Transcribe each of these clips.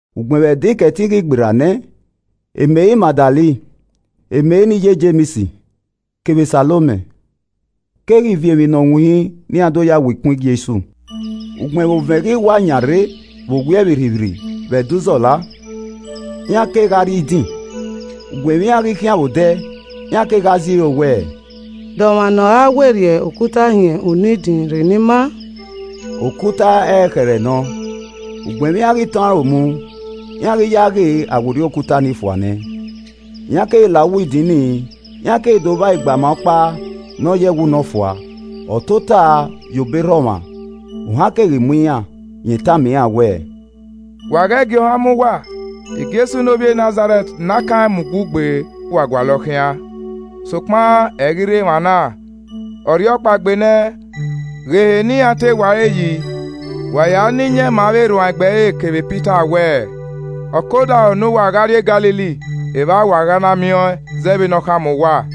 Ugbẹn vbe Ẹdẹ Ikẹtin ghi gberra nẹ, Meri Magdalen, Meri ne iye Jems, kevbe Salomẹ keghi viọ emwi ne ọ winhin ne iran do yae wo ikun e Jesu. Ugbẹn vbe ovẹn ghi wa yan rre vbe owiẹ vbirrivbirri vbe Ẹdẹ uzọla, iran kegha rrie idin. Ugbẹn vbe iran ghi khian vbe odẹ, iran kegha zẹ iro wẹẹ, “De ọmwa ne ọ ra werriẹ okuta hin unu idin rre ne ima?” (Okuta ẹrẹkhẹrẹ nọ.) Ugbẹn vbe iran ghi tọn aro mu, iran ghi ya ghe a werriẹ okuta ni fua nẹ. Iran keghi la uwu idin ni, iran keghi do vba igbama ọkpa ne ọ yọ ẹwu ne ọ fua, ọ tota ye obọ erha ọmwa, ohan keghi mu iran. Rẹn tama iran wẹẹ, “Wa ghẹ gie ohan mu uwa, Jesu ne ovbi Nazarẹt ne a kan rẹn mu ugbugbe wa gualọ khian. Sokpan ẹ i ghi rre emwa na, ọ rhiọkpaegbe nẹ, ghe ehe ne iran te wa ẹre yi. Wa ya na iyẹn ma avbe erhuanegbe kevbe Pita wẹẹ, ‘Ọ ke odaro ne uwa gha rrie Galili, evba wa gha na miẹn ọẹn zẹ vbene ọ khama uwa.’”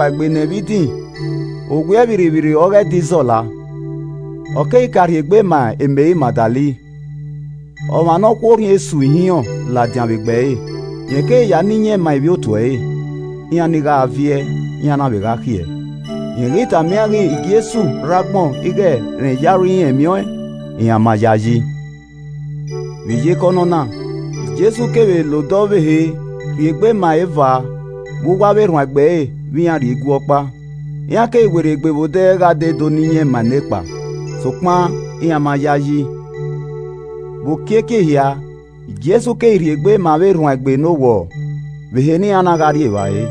Ugbẹn vbe Jesu ghi rhiọkpaegbe nẹ vbe idin, vbe owiẹ vbirrivbirri ọghe Ẹdẹ Izọla, ọ keghi ka rhie egbe ma Meri Magdalen, ọmwa ne ọ khu orhiọn esu ihinrọn ladian vbe egbe ẹre. Rẹn keghi ya na iyẹn ma ivbi otu ẹre. Iran ni gha viẹ, iran na vbe gha khiẹ. Rẹn ghi tama iran ighẹ Jesu rre agbọn ighẹ rẹn ye aro irẹn miẹn ọẹn, iran ma yae yi. Vbe iyeke ọnọna, Jesu keghi vbe la odẹ ọvbehe rhie egbe ma eva vbe uwu avbe erhuanegbe ẹre vbe iran rrie igue ọkpa. Iran keghi werriegbe vbe odẹ gha dee do na iyẹn ma e nekpa, sokpan iran ma yae yi. Vbe okiekie ehia, Jesu keghi rhie egbe ma avbe erhuanegbe ne owọrọ vbe ehe ne iran na gha rri evbare,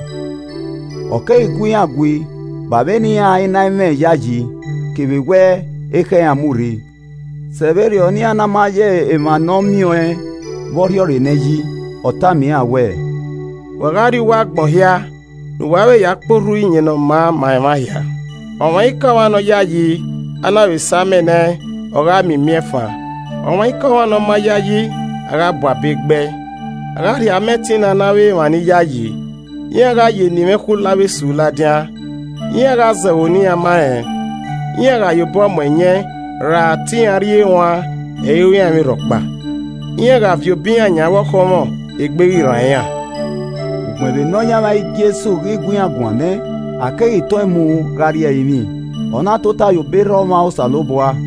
ọ keghi gu iran gui ba ẹmwẹ ne iran i na mwẹ iyayi kevbe wẹ ekhọe iran mu rri sẹ vberriọ ne iran ma na ya emwa ne ọ miẹn ọẹn vbe o rhiọrre nẹ yi. Ọ tama iran wẹẹ, “wa gha rrie uwu agbọn hia ne uwa vbe ya kpe orhu iyẹn ne ọ maa ma emwa hia. Ọmwaikọmwa ne ọ yayi, a na vbe samẹ nẹ ẹn, ọ gha miẹn imiẹnfan. Ọmwaikọmwa ne ọ ma yayi, a gha bu abe gbẹe. A gha rhie ama ẹtin na ne avbe emwa ni yayi. Iran gha ya eni mwẹ khulo avbe esu ladian. Iran gha zẹ ẹvbo ne iran ma rẹn. Iran gha ya obọ mu ẹyẹn ra te iran rri eruan, ẹ i ru iran emwi rhọkpa. Iran gha viọ obọ iran yan avbe ọkhọnmwọ, egbe ghi rran iran.” Ugbẹn vbe Nọyaẹnmwa Jesu ghi gu iran guan nẹ, a keghi tọn ẹn mu gha rrie ẹrinmwi, ọ na tota ye obọ erha ọmwa Osanobua.